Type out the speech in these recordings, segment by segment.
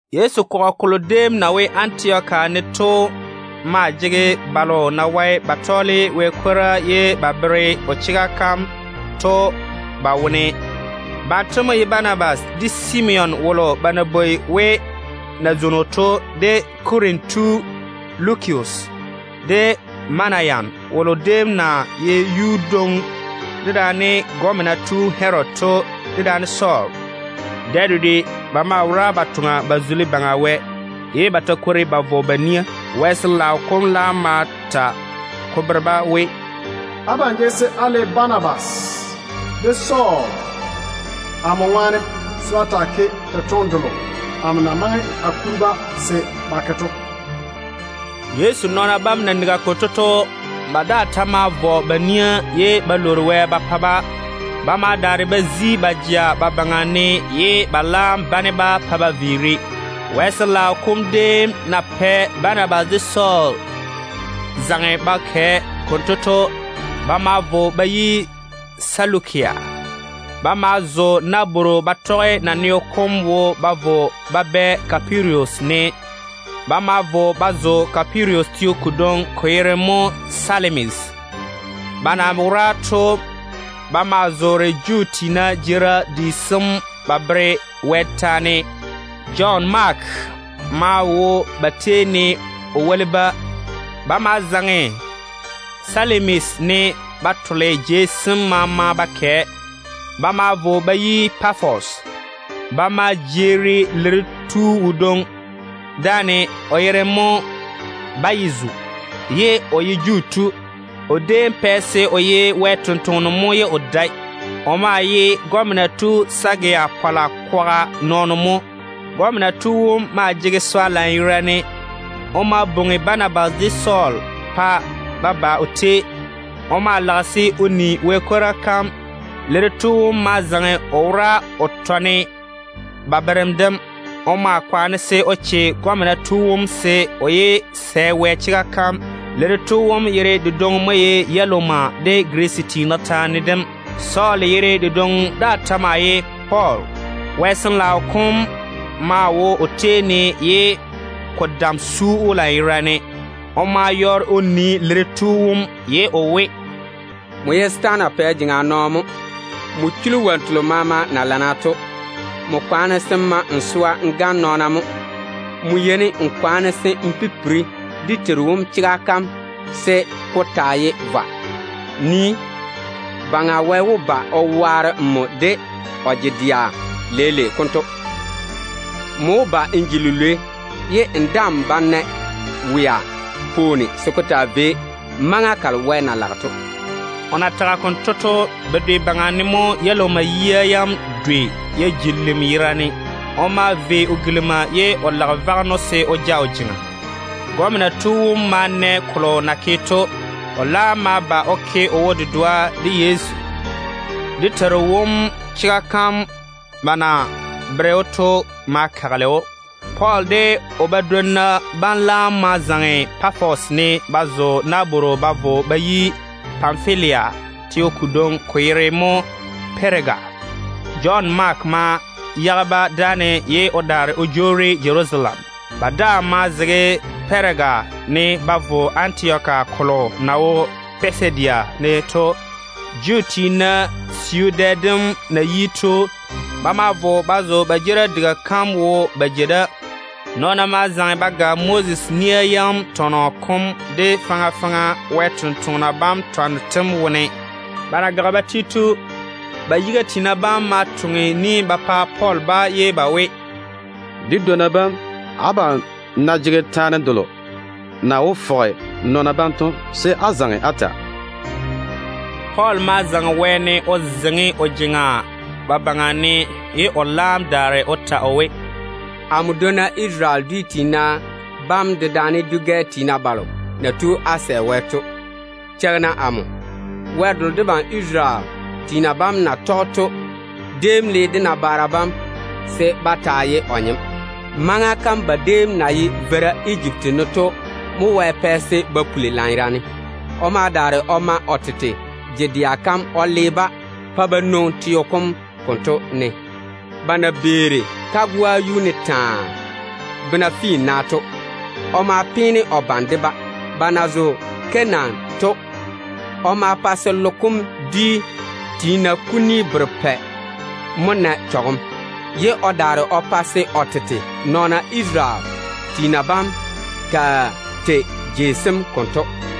Yezu kɔgɔ kolo déem na wo Antioka ne to maa jege Wɛ ni-jwoŋina balo na wae ba tɔɔle Wɛ kwora ye ba bere o chega kam to ba wone. Banto mo ye Banabas, de Simeon wolo ba na bwoi we nazwono to, de Kurene tu Lukius, de Manayan wolo déem na ye yuudwoŋo dedaane gɔmena tu Pɛ Herodi to, dedaane Sɔɔl. Dɛ dedwe ba maa wora ba ke kolo na wó pa Baŋa Wɛ zula to, ye ba ta kwori ba vɔ ba nia Wɛ ŋwaane. Wɛ Sin-laao kom laam ma ta ko bere-ba we, “Abam jege se á le Banabas de Sɔɔl amo ŋwaane se ba taa ke totoŋe delo amo na maŋe a kuri-ba se ba ke to.” Yezu nɔɔna bam na nigi konto to, ba daa ta ma vɔ ba nia ye ba lwoori Wɛ ba pa-ba. Ba ma daare ba daŋe ba jea ba baŋa ne, ye ba laam bane-ba pa ba viiri. Wɛ Sin-laao kom déem na pɛ Banabas de Sɔɔl zaŋe ba kɛ konto to, ba ma vo ba yi Selukia. Ba ma zo nabworo ba tɔge naneo kom wo ba vo ba bɛ ba yi Kupirus. Ba ma vo ba zo Kupirus teo kodwoŋi, ko yere mo Salamis. Ba na wora to, ba maa zoore Juu tiina jeerim di sem ba bere Wɛ taane. Jɔn Maake maa wo ba tei ne o woli-ba. Ba ma zaŋe Salamis ne ba tole jei sem maama ba kɛ. Ba ma vo ba yi Pafos. Ba ma jeeri liri tu wodwoŋi dáane, o yere mo Ba-yezu, ye o ye Juu tu. O déem pɛ se o ye Wɛ sampwora mo ye o dae. O maa ye gɔmena tu Sɛgiu Pɔɔla kwaga nɔɔno mo. Gɔmena tu wom maa ye yi-pore-nyem. O ma bwoŋi Banabas de Sɔɔl se ba ba o tei. O maa lage se o ni Wɛ kwora kam. Liri tu wom ma zaŋe o wora o tɔne ba berem dem. O maa kwaane se o che gɔmena tu wom se o yé sɛ Wɛ chega kam. Liri tu wom yere dedwoŋi mo ye Elumas de Girisi tiina taane dem. Sɔɔl yere dedwoŋi daa ta maa ye Pɔɔl. Wɛ Sin-laao kom maa wo o tei ne ye ko dam su‑o lanyerane. O ma yɔɔre o nii liri tu wom ye o we, “Nmo ye setaana pɛ jeŋa nɔɔno mo. Nmo chuli wonnu telo maama na lana to. Nmo kwaane se n ma n swa n gane nɔɔna mo. Nmo yeini n kwaane se n pipiri dé Teiru wom chega kam se ko taa ye vwa. Nii, Baŋa Wɛ wó ba o waare nmo de o je-dɛa leile konto. Nmo wó ba n ji lilwei ye n daa‑n bá‑n na wea pwooni se ko taa vei maŋa kalo Wɛ na lage to.” O na tage konto to, bedwe baŋa ne mo Yɛlumas yia yam dwei ya ji lim yerane. O maa kare o kekara ye o lage vaŋeno se o ja o jeŋa. Gɔmena tu wom ma na kolo na ke to. O laam ma ba o ke o wo-dedoa de Yezu. Dé Teiru wom chega kam ba na bere‑o to ma kagele‑o. Pɔɔl de o badwonna bam laam ma zaŋe Pafos ne ba zo nabworo ba vo ba yi Panfilia teo kodwoŋi, ko yere mo Pɛɛga. Jɔn Maake ma yage-ba dáane ye o daare o jwoori Jerusalem. Ba daa maa zege Pɛɛga ne ba vo Antioka kolo na wo Pisidia ne to. Juu tiina siu dɛ dem na yi to, ba ma vo ba zo ba jeerim diga kam wo ba jei da. Nɔɔna ma zaŋe ba ga Moses de faŋa faŋa Wɛ sampwori sem twanno tem wone. Ba na gage ba ti to, ba yiga tiina bam ma toŋe ni ba pa Pɔɔl ba ye ba we, “Dé nu-bia bam, abam ná jege taane delo na wó fɔge nɔɔna bam to, se á zaŋe á ta.” Pɔɔl ma zaŋe wɛɛne o zeiŋi o jeŋa ba baŋa ne, ye o laam daare o ta o we: “Amo dwonna Isarele dwi tiina bam dedaane dwi-gɛ tiina balo na tu á sɛ Wɛ to, cheigi-na amo. Isarele tiina bam Wɛ wom déem le dé nabaara bam se ba taa ye o nyem. Maŋa kam ba déem na ye veira Ejipti ne to mo Wɛ pɛ se ba puli lanyerane. O ma daare o ma o tete je-dɛa kam o le-ba pa ba nwoŋi teo kom konto ne. Ba na beeri kagoa yuu ne taa, bena finna to, o ma peene o bane de-ba. Ba na zo Kanaan to, o ma pa se logo kom dwia yera yera kuni berepɛ na chɔgem, ye o daare o pa se o tete nɔɔna Isarele tiina bam taa tei tega kam konto.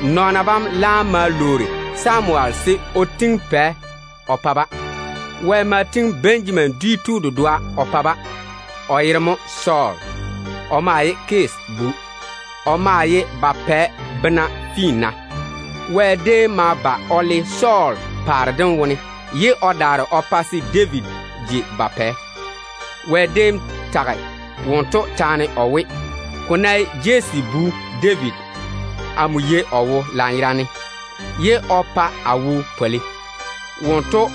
Nɔɔna bam laam ma lwoori Samuwel se o tiŋi pɛ o pa-ba. Wɛ ma tiŋi Benjamin dwi tu dedoa o pa-ba, o yere mo Sɔɔl. O maa ye Kisi bu. O ma di paare bena finna. Wɛ déem ma ba o le Sɔɔl paare dem wone, ye o daare o pa se David ji ba pɛ. Wɛ déem tage wonto taane o we, ‘Ko ná ye Jesse bu David, o ye nɔɔno wolo kikia na dɛ amo wo to. Wonto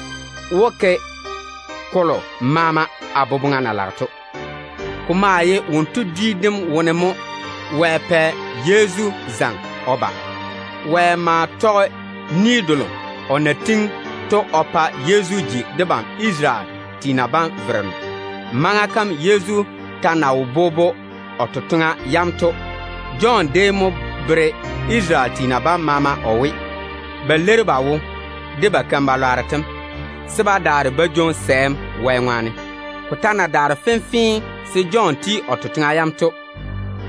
wó ke kolo maama a boboŋa na lage to.’ Ko maa ye wonto dwi dem wone mo Wɛ pɛ Yezu zaŋe o ba. Wɛ ma tɔge ni delo o na tiŋi o pa o nɔɔna bam to o pa Yezu ba o ji debam Isarele tiina bam Vereno. Maŋa kam Yezu ta na wo bobo o totoŋa yam to, Jɔn déem mo bere Isarele tiina bam maama o we, ba leiri ba wo de ba wɛleera yam, se ba daare ba jwoŋi sɛɛm Wɛ ŋwaane. Ko ta na daare fenfee se Jɔn ti o totoŋa yam to,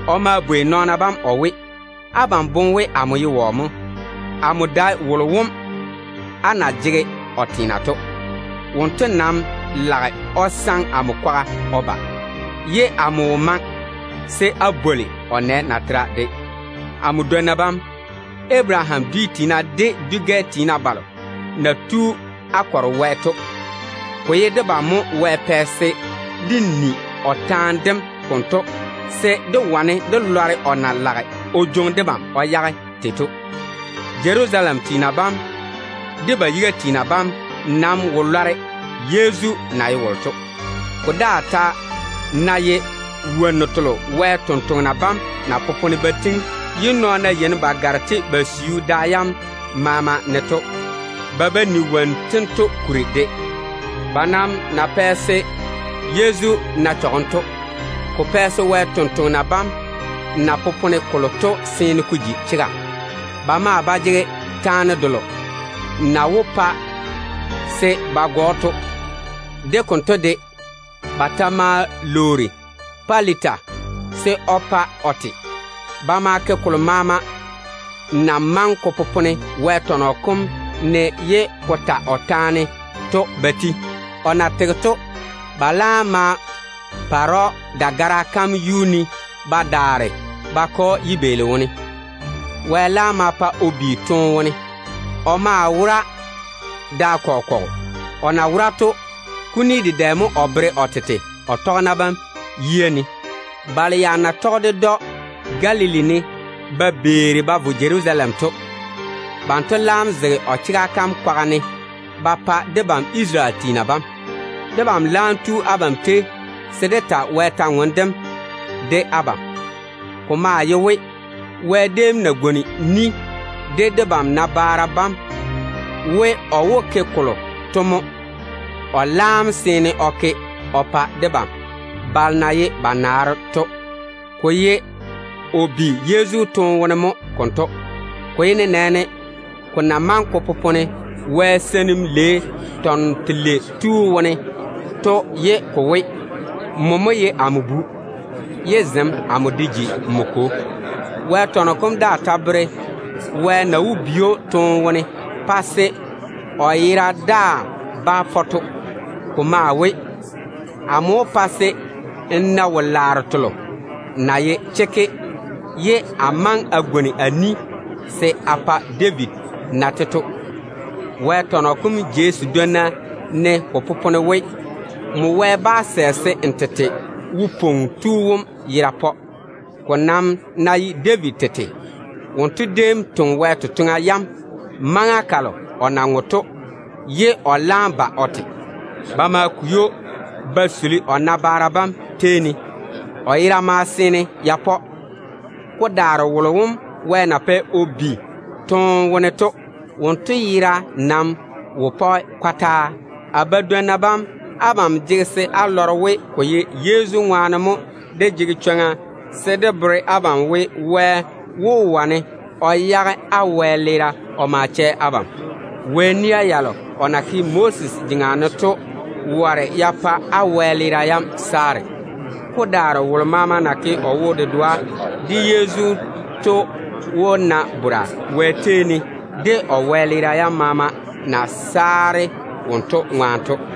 o ma bwei nɔɔna bam o we, ‘Abam boŋe we amo ye wɔ mo? Amo dae wolo wom á na jege o teena to. Wonto nam lage o saŋe amo kwaga o ba, ye amo wo maŋe se a bwoli o nɛ natera de.’ Amo nu-bia bam, Abaraham dwi tiina, de dwi-gɛ tiina balo na tu á kɔre Wɛ to, ko ye debam mo Wɛ pɛ se dé ni o taane dem konto se dé wane dé lɔre o na lage o jwoŋi debam o yage tei to. Jerusalem tiina bam de ba yiga tiina bam nam wo lɔre Yezu na ye wolo to. Ko daa ta ná ye wonnu telo Wɛ sampwori sem na popone ba tiŋi ye nɔɔna yeini ba gare-te ba siu da yam maama ne to, ba ba ni wonnu tento kuri de. Ba nam na pɛ se Yezu na chɔgem to, ko pɛ se Wɛ sampwori sem na popone kolo to seene ko ji chega. Ba maa wo nɛ taane delo na wó pa se ba go‑o to. De konto de, ba ta ma lwoori Pilata se o pa o te. Ba ma ke kolo maama na maŋe ko popone Wɛ tɔnɔ kom ne ye ko ta o taane to ba ti. O na tege to, ba laam ma pare‑o dagara kam yuu ne ba daare ba ke‑o yibeeli wone. Wɛ laam ma pa o bi toone wone. O maa wora da kɔgɔ kɔgɔ. O na wora to, kuni dedɛ mo o veere o tete o tɔgena bam yia ne. Balo ya na tɔge ded‑o Galili ne ba beeri ba vo Jerusalem to mo konto. Banto laam zege o chega kam kwaga ne ba pa debam Isarele tiina bam. Debam laam tu abam tei se dé ta Wɛ kwor-ywoŋa kam dé bere abam. Ko maa ye we, Wɛ déem na pwooli de dé nabaara bam we o wó ke kolo to mo o laam seene o ke o pa debam balo na ye ba naaro to. Ko ye o bi Yezu toone wone mo konto. Ko ta ye nenɛɛne ko na maŋe ko popone Wɛ Seinim Lei tɔnɔ belei tu wone to ye ko we: ‘Nmo mo ye amo Bu, ye zem amo de ji nmo Kwo.’ Wɛ tɔnɔ kom daa ta bere Wɛ na wó bi‑o toone wone pa se o yera daa bá pɔ to. Ko maa we: ‘Amo wó pa se n na wo-laaro telo na ye chekke ye a maŋe a tiŋi ni se a pa David na-te to.’ Wɛ tɔnɔ kom jei sedwoŋi ne ko popone we: ‘Nmo bá‑n sɛ se n tete Wo-pwoŋo Tu wom yera pɔ.’ Ko nam ná ye David tete, wonto déem toŋe Wɛ totoŋa yam maŋa kalo o na ŋwe to ye o laam ba o te. Ba ma kwei‑o ba suli o nabaara bam tei ne. O yera ma seene ya pɔ. Ko daare wolo wom Wɛ na pɛ o bi toone wone to, wonto yera nam wo pɔge kɔtaa. A nu-bia bam, abam jege se á lɔre we ko ye Yezu ŋwaane mo dé jege chwoŋa se dé bere abam we, Wɛ wó wane o yage á wɛleera o ma chɛ abam. Wɛ nia yalo o na ke Moses jeŋa ne to ware ya pa á wɛleera yam saare. Ko daare wolo maama na ke o wo-dedoa de Yezu to wó na bora Wɛ tei ne, de o wɛleera yam maama na saare wonto ŋwaane to.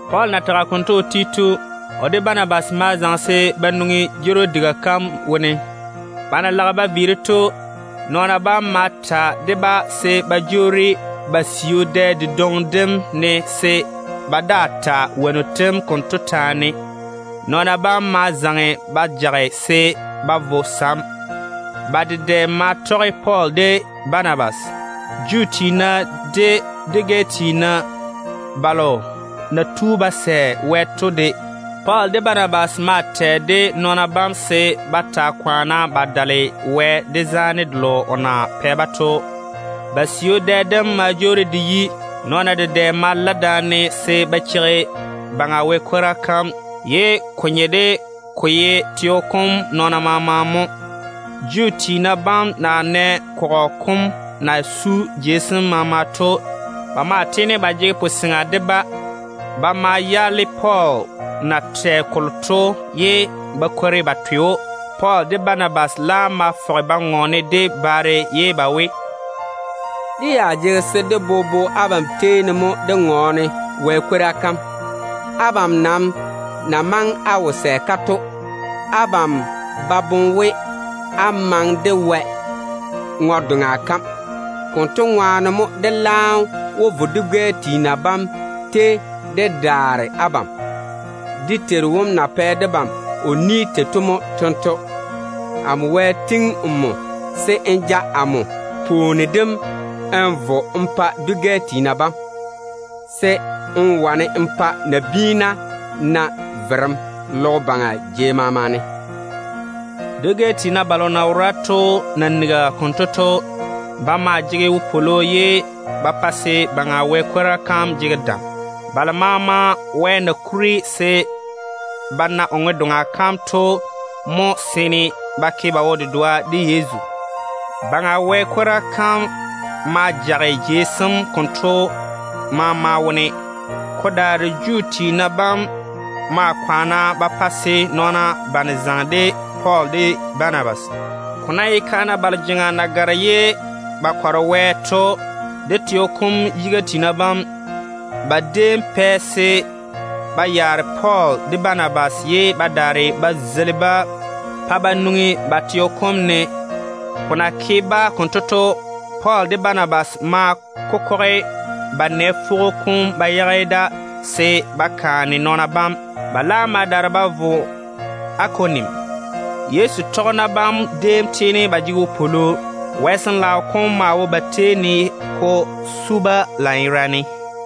Pɔɔl na tage konto o ti to, o de Banabas ma zaŋe se ba nwoŋi jeerim diga kam wone. Ba na lage ba viiri to, nɔɔna bam ma ta de-ba se ba jwoori ba siu dɛ dedwoŋi dem ne, se ba daa ta wonnu tem konto taane. Nɔɔna bam ma zaŋe ba jage se ba vo sam. Ba dedɛ ma tɔge Pɔɔl de Banabas, Juu tiina de dwi-gɛ tiina balo na tu ba sɛ Wɛ to de. Pɔɔl de Banabas maa tɛ de nɔɔna bam se ba taa kwaane ba dale Wɛ, de zaane delo o na ke ba yuu ne to. Ba siu dɛ dem ma jwoori de yi. Nɔɔna dedɛ ma la daane se ba cheigi Baŋa Wɛ kwora kam. Ko déem nye de ko ye teo kom nɔɔna maama mo jeeri da. Juu tiina bam na nɛ kɔgɔ kom na su jei sem maama to, ba maa tiini ba jege puseŋa de-ba. Ba ma yaale Pɔɔl na tɛ kolo to ye ba kwori ba twe‑o. Pɔɔl de Banabas laam fɔge ba ŋɔɔne de baare ye ba we, “Dé ya jege se dé bobo abam tei ne mo dé ŋɔɔne Wɛ kwora kam. Abam nam na maŋe á wo sɛ-ka to, ko bere we á ba boŋe se á maŋe de Wɛ ŋwe-doŋa kam. Konto ŋwaane mo dé laam wó vo dwi-gɛ tiina bam tei dé daare abam. Dé Teiru Baŋa Wɛ na pɛ debam o ni tei to mo tento: ‘Amo tiŋi nmo se n ji pwooni n nye dwi-gɛ tiina bam baŋa ne, se n wane n pa nabiina na verem logo baŋa jei maama ne.’” Dwi-gɛ tiina balo na wora to na nigi konto to, ba maa jege wopwolo ye ba pa se Baŋa Wɛ kwora kam jege dam. Balo maama Wɛ na kuri se ba na o ŋwe-doŋa kam to mo seene ba ke ba wo-dedoa de Yezu. Baŋa Wɛ kwora kam ma jage laŋa kam konto maama wone. Ko daare Juu tiina bam ma kwaane ba pa se nɔɔna bane zaŋe de Pɔɔl de Banabas. Ko ná ye kaana balo jeŋa na gare ye ba kɔre Wɛ to, de teo kom dedɛɛra bam, ba déem pɛ se ba yaare Pɔɔl de Banabas, ye ba daare ba zeili-ba pa ba nwoŋi ba teo kom ne. Ko na ke-ba konto to, Pɔɔl de Banabas ma kokɔge ba nɛ fwogo kom ba yage da se ba kaane nɔɔna bam. Ba laam ma daare ba vo Ikonium. Yezu tɔgena bam déem tiini ba di ywoni. Wɛ Sin-laao kom maa wo ba tei ne ko su-ba lanyerane.